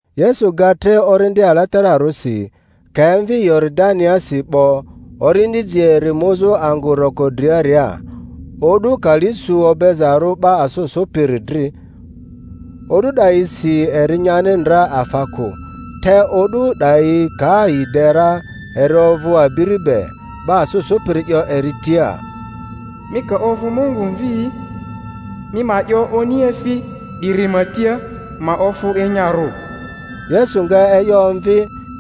Yesu ga tre Orindi Alatararᴜsi, ka emvi Yoridaniasi 'bo, Orindi ji eri muzᴜ angᴜ roko driaria, o'du kali su obezarᴜ 'ba asᴜ sᴜpiri dri. O'du 'dayisi eri nyani ndra afa kᴜ, te o'du 'dayi ka yi de ra eri ovᴜ abiri be. 'Ba asᴜ sᴜpiri 'yo eri tia, Mi ka ovᴜ Mungu Mvi'i, mi ma 'yo oniefi 'diri ma tia, ma ofᴜ enyarᴜ. Yesu nga e'yo omvi,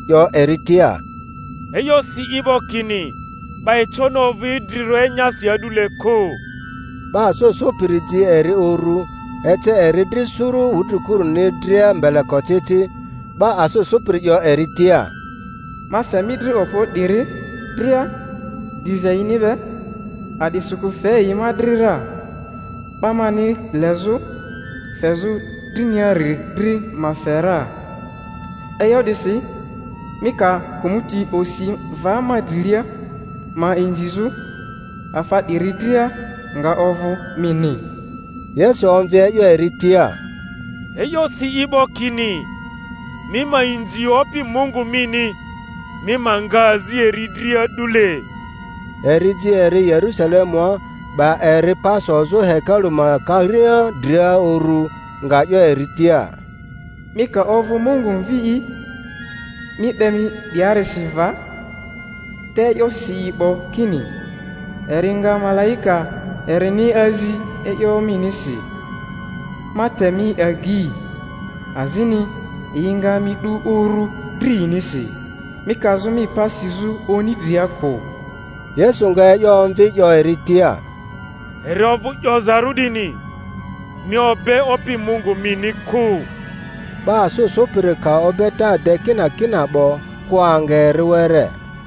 'yo eri tia, E'yo si i 'bo kini, 'Ba econi ovᴜ idrirᴜ enyasi a'dule kᴜ. 'Ba asᴜ sᴜpiri ji eri uru, ece eri dri suru wudrikuruni dria mbelekocici; 'ba asᴜ sᴜpiri 'yo eri tia, Ma fe mi dri okpo 'diri dria, diza yini be; a'disikᴜ fe yi ma dri ra, 'ba mani lezᴜ fezᴜ driniari dri ma fe ra. E'yo 'disi mi ka kᴜmᴜti osi va ma drilia ma inzizᴜ, afa 'diri dria nga ovᴜ mini. Yesu omvi e'yo eri tia, E'yo si i 'bo kini, Mi ma inzi Opi Mungu mini, mi ma nga azi eri dri a'dule. Eri ji eri Yerᴜsalemua, 'ba eri pa sozᴜ hekalu ma karia dria urᴜ, nga 'yo eri tia, Mi ka ovᴜ Mungu Mvi'i, mi 'be mi 'diarisi va; te e'yo si i 'bo kini, Eri nga malaika erini azi e'yo minisi, ma te mi agei, azini, Yi nga mi 'du uru dri yinisi, mi kazᴜ mi pa sizᴜ oni dria kᴜ. Yesu nga e'yo omvi 'yo eri tia, Eri ovᴜ 'yozarᴜ 'dini, Mi obe Opi Mungu mini kᴜ. 'Ba asᴜ sᴜpiri ka obeta de kinakina 'bo, kᴜ anga eri were.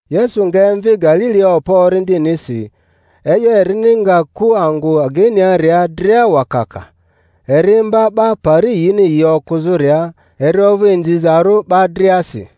Yesu nga emvi Galilia okpo Orindinisi; e'yo erini nga ku angᴜ ageiniaria dria wakaka. Eri imba 'ba pari yini yi okᴜzᴜria, eri ovᴜ inzizarᴜ 'ba driasi.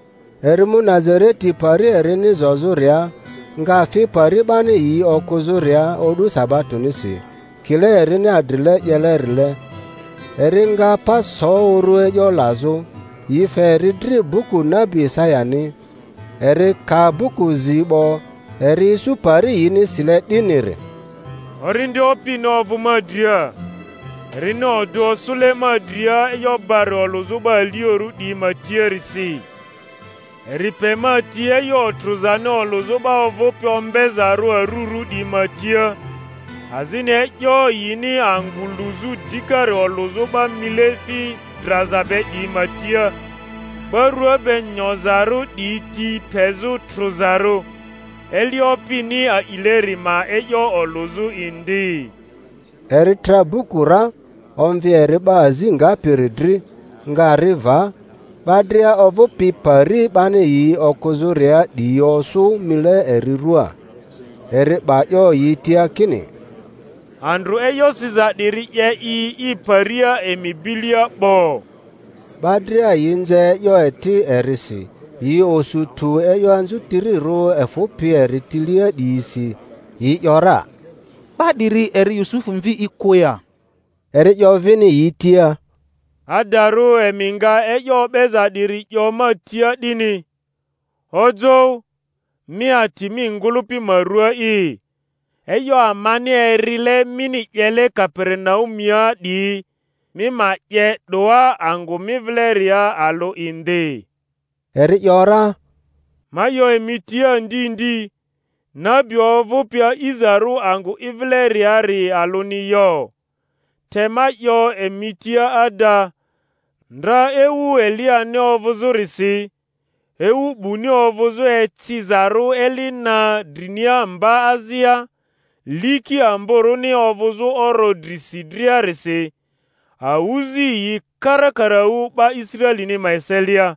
Eri mu Nazareti pari erini zozᴜria; nga fi pari 'bani yi okᴜzᴜria o'du sabatonisi, kile erini adrile 'yelerile. Eri nga pa so urᴜ e'yo lazᴜ; yi fe eri dri buku nabi Isayani. Eri ka buku zi 'bo, eri isu pari yini sile 'diniri, Orindi Opini ovᴜ ma dria, erini odᴜ osᴜle ma dria e'yo barᴜ olᴜzᴜ 'ba aliorᴜ 'diyi ma tiarisi. Eri pe ma ti e'yo otrᴜzani olᴜzᴜ 'ba ovᴜpi ombezarᴜ arurᴜ 'diyi ma tia, azini e'yo yini angᴜ luzᴜ dikari olᴜzᴜ 'ba mileefi draza be 'diyi ma tia, 'ba rua be nyozarᴜ 'diyi ti pezᴜ trᴜzarᴜ, eli Opini a'ileri ma e'yo olᴜzᴜ indi. Eri tra buku ra, omvi eri 'ba azi ngapiri dri, nga ri va; 'ba dria ovᴜpi pari 'bani yi okᴜzᴜria 'diyi osᴜ mile eri rᴜaa. Eri 'ba 'yo yi tia kini, Andrᴜ e'yo siza 'diri 'ye i i paria emi bilia 'bo. 'Ba dria yi nze e'yo eti erisi, yi osu tᴜ e'yo anzutirirᴜ efᴜpi eri tilia 'diyisi; yi ‘yora, 'Ba 'diri eri Yusufᴜ mvi'i kᴜ ya? Eri 'yo vini yi tia, Adarᴜ emi nga e'yo o'beza 'diri 'yo ma tia 'dini, Ojoᴜ, mi ati mi ngᴜlᴜpi ma rua'i; e'yo amani erile mini 'yele Kaperinaumua 'diyi, mi ma 'ye 'doa angᴜ mi vileria alᴜ indi. Eri ‘yora, Ma 'yo emi tia ndi ndi, Nabi ovᴜpi a'izarᴜ angᴜ i vileriari alᴜni yo. Te ma 'yo emi tia ada, Ndra ewu Eliyani ovᴜzᴜrisi, ewu 'buni ovᴜzᴜ ecizarᴜ eli na drinia mba azia, liki amboruni ovᴜzᴜ oro drisi driarisi, awᴜzi yi karakaraᴜ 'ba Israelini ma eselia;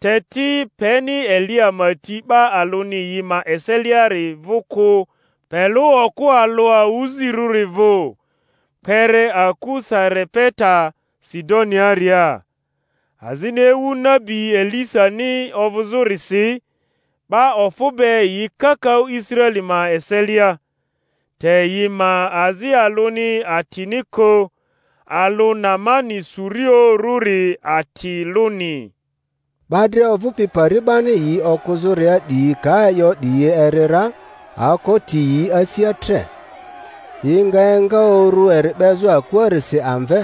te ti, peni Eliya ma ti 'ba alᴜni yi ma eseliari vᴜ kᴜ pe lᴜ okᴜ alᴜ awᴜzirᴜri vᴜ, kpere aku Sarepeta Sidoniaria. Azini ewu nabi Elisani ovᴜzᴜrisi, 'ba ofᴜ be yi kakaᴜ Israeli ma eselia; te yi ma azi alᴜni atini kᴜ, alᴜ Naamani Surioᴜrᴜri ati lᴜni. 'Ba dria ovᴜpi pari 'bani yi okᴜzᴜria 'diyi ka e'yo 'diyi eri ra, aoko ti yi asia tre. Yi nga enga uru eri 'bezᴜ akuarisi amve,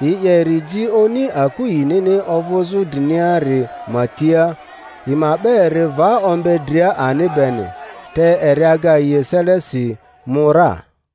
yi 'ye eri ji oni aku yinini ovᴜzᴜ driniari ma tia, yi ma 'be eri va ombe dria ani beni. Te eri aga yi eselesi, mu ra.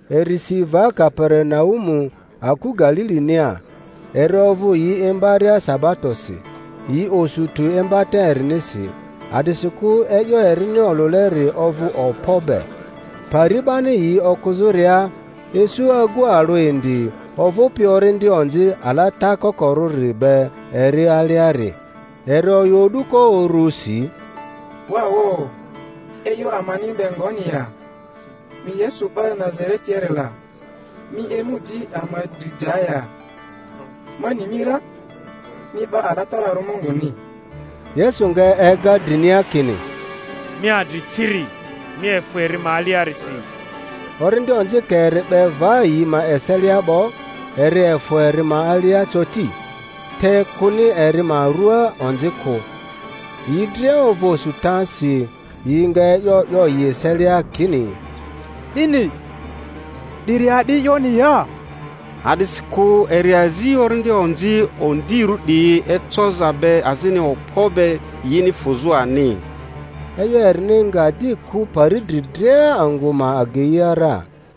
Eri si va Kaperinaumu aku Galilinia. Eri ovᴜ yi imbaria sabatosi; yi osu tᴜ imbata erinisi, a'disikᴜ e'yo erini olᴜleri ovᴜ okpo be. Pari 'bani yi okᴜzᴜria, isu agu alᴜ indi ovᴜpi orindi onzi alata kokorᴜri be eri aliari; eri oyᴜ o'duko urusi, Wa wo! E'yo amani mi be ngoni ya, mi Yesu 'ba Nazaretiari la? Mi emu di ama dri ja ya? Ma ni mi ra, mi 'Ba Alatararᴜ Munguni. Yesu nga ega drinia kini, Mi adri ciri, mi efᴜ eri ma aliasi! Orindi onzi ka eri 'be va yi ma eselia 'bo, eri efᴜ eri ma alia coti, te kᴜni eri ma rᴜa onzi kᴜ. Yi dria ovᴜ osutasi, yi nga e'yo 'yo yi eselia kini, 'Dini 'diri a'di e'yoni ya? A'disikᴜ eri azi orindi onzi ondirᴜ 'diyi ecoza be azini okpo be, yini fᴜzᴜ ani. E'yo erini nga di ku pari dri dria angᴜ ma ageia ra.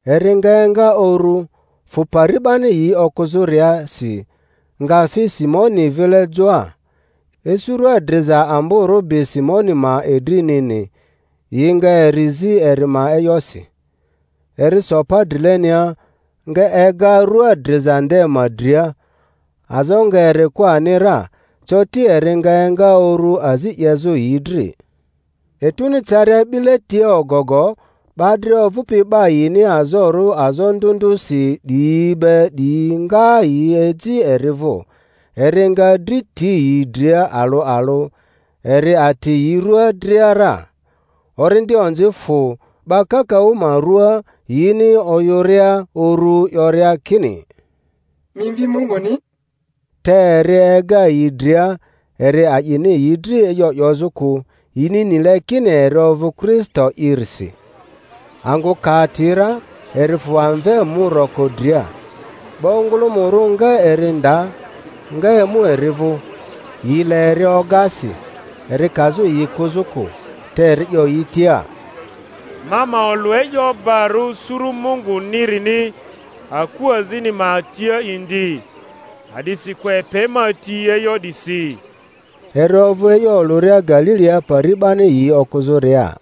Eri nga enga uru, fᴜ pari 'bani yi okᴜzᴜriasi, nga fi Simoni vile joa. Isu rua driza amborᴜ bi Simoni ma idrinini, yi nga eri zi eri ma e'yosi. Eri so pa drilenia, nga ega rua driza nde ma dria; azo nga eri kᴜ ani ra; coti eri nga enga uru azi 'yezᴜ yi dri. Etuni caria 'bile tia ogogo, 'ba dria ovᴜpi 'ba yini azorᴜ azo ndᴜ ndᴜsi 'diyi be 'diyi nga yi eji eri vᴜ; eri nga dri ti yi dria alᴜ alᴜ, eri ati yi rua dria ra. Orindi onzi fᴜ 'ba kakaᴜ ma ruaa, yini oyᴜria uru 'yoria kini, Mi Mvi Munguni! Te eri ega yi dria, eri a'ini yi dri e'yo 'yozᴜ kᴜ, yini nile kini eri ovᴜ Kristo'irisi. Angᴜ ka ati ra, eri fᴜ amve mu roko dria. 'Ba ongᴜlᴜmᴜrᴜ nga eri nda, nga emu eri vᴜ, yi le eri oga si, eri kazᴜ yi kᴜzᴜ kᴜ; te eri 'yo yi tia, Ma ma olᴜ e'yo barᴜ suru Mungunirini aku azini ma tia indi; a'disikᴜ epe ma ti e'yo 'disi. Eri ovᴜ e'yo olᴜria Galilia pari 'bani yi okᴜzᴜria.